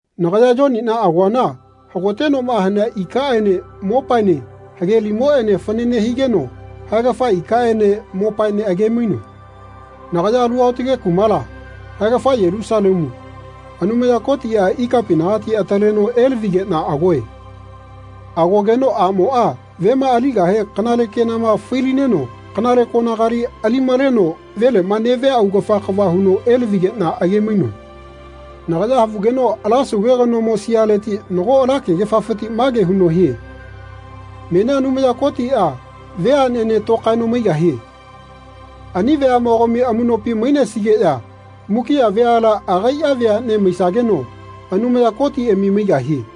Nagaya Yoniꞌna agoana hagotenoꞌma hanea ikaꞌene mopaene hage limoꞌene fanane higeno haegafa ikaꞌene mopaene age-mainoe. Nagaya alu aotage kumala, haegafa Yelusalemu, Anumaya Kotiꞌa ikapinagati ataleno elavigeꞌna agoe. Agogeno aꞌmoꞌa vema aligahe kanale kenama fai-lineno kanale konagali ali-maleno veleꞌma neꞌvia augafa kava huno elavigeꞌna age-mainoe. Nagaya havugeno ala sauve kanomo sialeti nago ala kegefafiti mage huno hie “Menia Anumaya Kotiꞌa veaꞌnene tokaeno maigahie. Ani veaꞌmogami amuꞌnopi mainesigeꞌya mukiꞌa veala agaiꞌa veaꞌne maisageno Anumaya Kotiꞌami maigahie.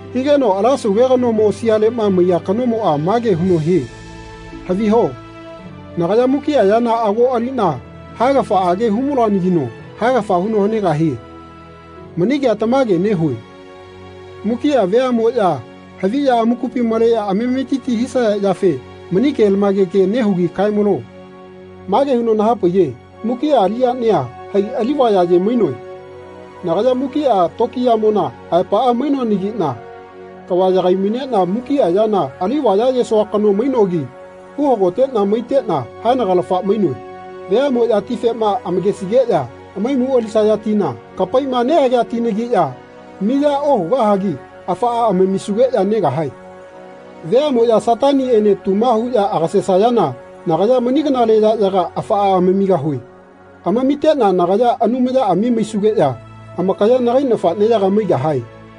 Higeno ala Sauve kanomo sialeꞌma maiya kanomoꞌa mage huno hie “Haviho nagaya mukiꞌa yana ago aliꞌna haegafaꞌage hu-maluanagino haegafa huno hanegahie. Mani kea tamage nehue. Mukiꞌa veaꞌmoꞌya haviꞌya amakupi maleꞌya amametiti hisaya yafe mani kelamage ke nehugi kae-malo.” Mage huno nahapaiye “Mukiꞌa aliꞌyania hai alivaya aye-mainoe. Nagaya mukiꞌa tokiyamona aepaꞌa mainoanagiꞌna kava yagai-maineꞌna mukiꞌa yana ali vayayesoa kano mainogi uhagoteꞌna maiteꞌna haenagalafa mainoe. Veaꞌmoꞌya tifema amakesigeꞌya hamaimu alisaya tina kapaiꞌma nehagea tinagiꞌya miya ohugahagi afaꞌa amamisugeꞌya negahae. Veaꞌmoꞌya Sataniꞌene tuma huꞌya agasesayana nagaya mani kanale yaꞌyaga afaꞌa amamigahue. Amamiteꞌna nagaya Anumayaꞌami maisugeꞌya amakaya nagai nafaꞌneyaga maigahae.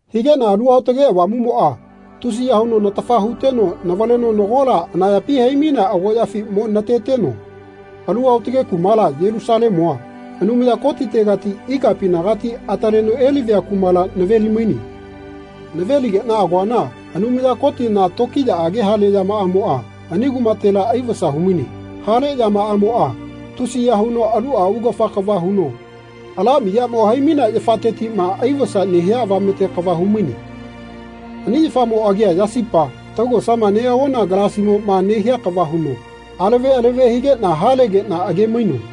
Higeꞌna Alu Aotage Avamuꞌmoꞌa tusiya huno natafa huteno navaleno nagola anayapi hai-mainea agoꞌyafi mo nateteno alu aotage kumala, Yelusalemua, Anumaya Kotitegati ikapinagati ataleno elavia kumala naveli-maine. Nave-ligeꞌna agoana Anumaya Kotina tokiyaꞌage hale yamaꞌamoꞌa ani kumatela aivasa humaine. Hale yamaꞌamoꞌa tusiya huno aluꞌa augafa kava huno ala miyamo hai-mainea yafatetiꞌma aivasa nehia avamete kava humaine. Ani yafamo agia yasipa taugosama neꞌagona galasimoꞌma nehia kava huno alave alave higeꞌna halegeꞌna age-mainoe.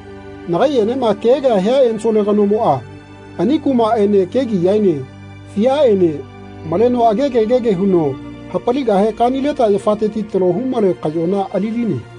Nagaiꞌenema kea kea hia ensole kanomoꞌa ani kumaꞌene kegiꞌyaene fiaꞌene maleno agege gege huno hapaligahe kanileta yafateti talo humale kaꞌyona ali-line.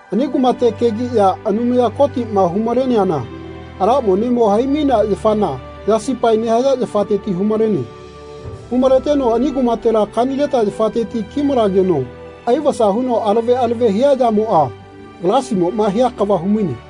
Ani kumate kegiꞌya Anumaya Kotiꞌma hu-maleana ala monemo hai-mainea yafana yasipae nehaya yafateti hu-malene. Hu-maleteno ani kumatela kanileta yafateti ki-malegeno aivasa huno alave alave hia yamoꞌa galasimoꞌma hia kava humaine.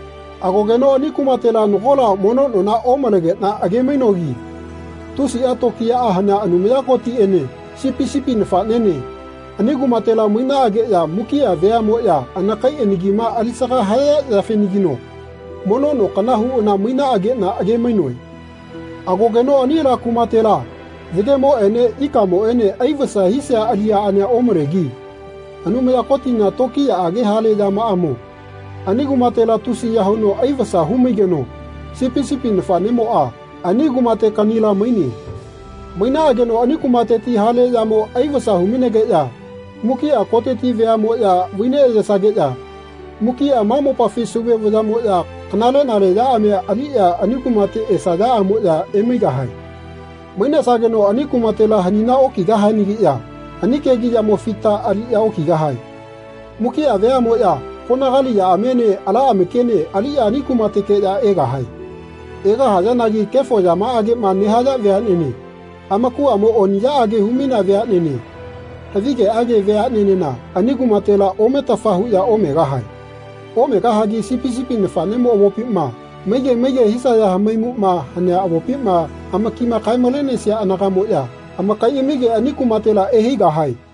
Agogeno ani kumatela nagola mono nona omalegeꞌna age-mainogi tusiꞌa tokiyaꞌa hanea Anumaya Kotiꞌene Sipi sipi nafaꞌnene ani kumatela mainaꞌageꞌya mukiꞌa veaꞌmoꞌya anakai anakima alisaga haya yafenagino mono no kana huꞌana mainaꞌageꞌna age-mainoe. Agogeno ani ala kumatela yagemoꞌene ikamoꞌene aivasa hisia aliꞌyaꞌania omalegi Anumaya Kotina tokiyaꞌage hale yamaꞌamo ani kumatela tusiya huno aivasa hu-maigeno Sipi sipi nafaꞌnemoꞌa ani kumate kaꞌnila maine. Mainaꞌageno ani kumateti hale yamo aivasa hu-mainegeꞌya mukiꞌa koteti veaꞌmoꞌya vai neꞌyesageꞌya mukiꞌa ma mopafi Sauve vayaꞌmoꞌya kanale-nale yaꞌamia aliꞌya ani kumate esaꞌyaꞌamoꞌya emaigahae. Mainesageno ani kumatela hanina okigahianagiꞌya ani kegiꞌyamo fita aliꞌya okigahae. Mukiꞌa veaꞌmoꞌya konagali yaꞌamiene ala amakiene aliꞌya ani kumatekeꞌya egahae. Egahayanagi kefo yamaꞌageꞌma nehaya veaꞌnene, amakuꞌamo oniꞌyaꞌage hu-mainea veaꞌnene, havigeꞌage veaꞌnenena ani kumatela ometafa huꞌya omegahae. Omegahagi Sipi sipi nafaꞌnemo avopima, maige maige hisaya hamaimuꞌma hanea avopima amakima kae-malenesia anagaꞌmoꞌya amakaiꞌamige ani kumatela ehaigahae.